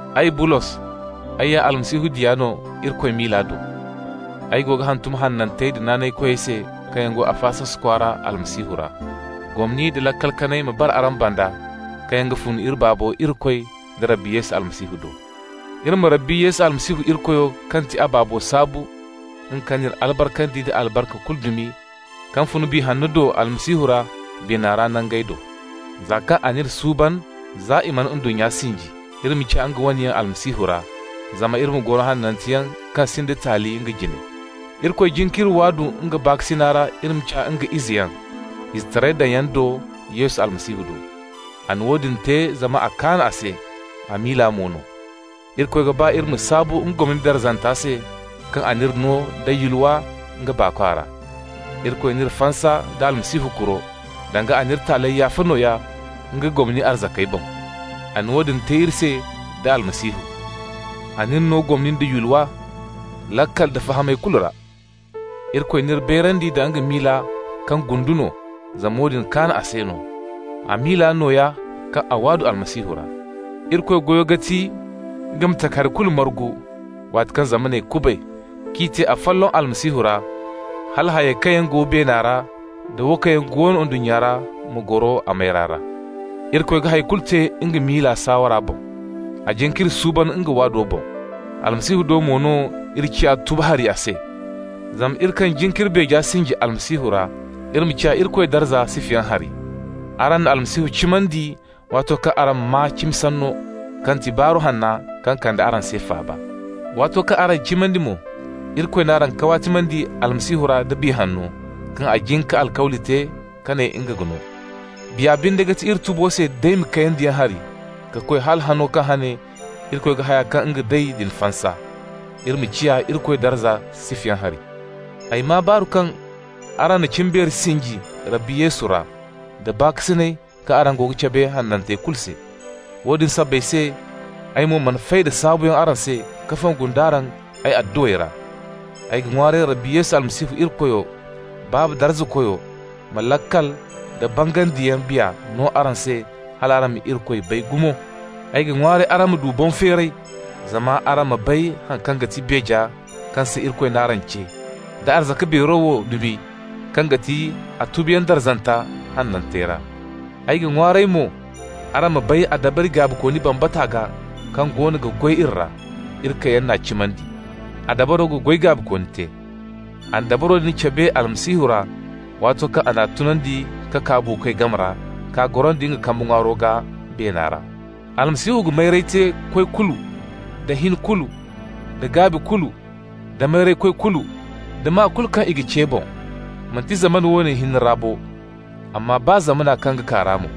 Ay, Bulos, ay ya Almasihu Yesu diya no Irikoy miila do. Ay go ga hantum hanantey da naanaykoyey se kaŋ yaŋ go Afasos kwaara Almasihu ra. Gomni nda laakal kanay ma bara araŋ banda kaŋ yaŋ ga fun iri Baabo Irikoy da Rabbi Yesu Almasihu do. Iri ma Rabbi Yesu Almasihu Irikoyo kaŋ ti a Baabo saabu, nga kaŋ n'iri albarkandi nda albarka kulu dumi kaŋ fun Biya Hanno do Almasihu ra beena ra nangey do. Za kaŋ a n'iri suuban za i mana ndunnya sinji, iri ma ciya nga wane yaŋ Almasihu ra, zama iri ma goro hananteyaŋ kaŋ sinda taali nga jine. Irikoy jin k'iri waadu nga baakasina ra iri ma ciya nga izeyaŋ, izetaray daŋyaŋ do, Yesu Almasihu do. A na woodin te zama a ga kaan a se, a miila mo no. Irikoy ga ba iri ma saabu nga gomni darzanta se kaŋ a n'iri no da yulwa nga Baakwa ra. Irikoy n'iri fansa nda Almasihu kuro, danga a n'iri taaley yaafa nooya nga gomni arzakey boŋ. A na woodin te iri se da Almasihu. A n'iri no gomni nda yulwa, laakal da fahamay kulu ra. Irikoy n'iri bayrandi nda nga miila kaŋ gundu no, zama woodin kaan a se no. A miila nooya kaŋ a waadu Almasihu ra. Irikoy goyo ga ti nga ma takahari kulu margu waati kaŋ zamaney kubay k'i te afolloŋ Almasihu ra, hala hayey kaŋ yaŋ go beena ra da wo kaŋ yaŋ go ndunnya ra ma goro a mayra ra. Irikoy ga hay kulu te nga miila saawara boŋ. A jin k'iri suuban nga waado boŋ. Almasihu do mo no iri ciya tubu hari a se. Zama iri kaŋ jin k'iri beeja sinji Almasihu ra, iri ma ciya Irikoy darza sifayaŋ hari. Araŋ na Almasihu cimandi waato kaŋ araŋ maa cimi sanno, kaŋ ga ti Baaru Hanna kaŋ kande araŋ se faaba. Waato kaŋ araŋ cimandi mo, Irikoy n'araŋ kawaatimandi Almasihu ra da Biya Hanno, kaŋ a jin ka alkawli te ka ne nga ga no. Biya binde ga ti iri tubo se daymi kayandiyaŋ hari ka koy hala hano kaŋ hane Irikoy ga haya kaŋ nga day din fansa, iri ma ciya Irikoy darza sifayaŋ hari. Ay maa baaru kaŋ araŋ na cimbeeri sinji Rabbi Yesu ra, da baakasina kaŋ araŋ go ga cabe hanantey kulu se. Woodin sabbay se ay mo mana fay da saabuyaŋ araŋ se ka fongu nd'araŋ ay adduwey ra. Ay ga ŋwaaray Rabbi Yesu Almasihu Irikoyo, Baaba darzakoyo, ma laakal da bangandiyaŋ Biya no araŋ se hal araŋ ma Irikoy bay gumo. Ay ga ŋwaaray araŋ ma du boŋ-feeray zama araŋ ma bay haŋ kaŋ ga ti beeja kaŋ se Irikoy n'araŋ ce, da arzaka beero wo dumi kaŋ ga ti a tubuyaŋ darzanta hanantey ra. Ay ga ŋwaaray mo araŋ ma bay a dabari gaabikooni bambata gaa kaŋ goono ga goy iri ra, iri kaŋ yaŋ n'a cimandi. A dabaro ga goy gaabikooni te. A na dabaro din cabe Almasihu ra waato kaŋ a n'a tunandi ka kaa buukoy game ra k'a gorandi nga kambe ŋwaaro gaa beena ra. Almasihu ga mayray te koy kulu, da hin kulu, da gaabi kulu, da mayraykoy kulu, da maa kulu kaŋ i ga ce boŋ, manti zamana wo hinne ra bo, amma baa zamana kaŋ ga kaa ra mo.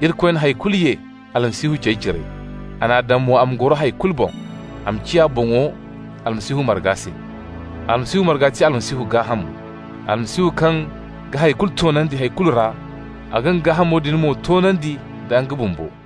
Irikoy na hay kulu ye Almasihu cey cire. A n'a daŋ mo a ma goro hay kulu boŋ, a ma ciya boŋo Almasihu marga se. Almasihu marga ga ti Almasihu gaahamo. Almasihu kaŋ ga hari kulu toonandi hay kulu ra, a ga nga gaahamo din mo toonandi da nga bumbo.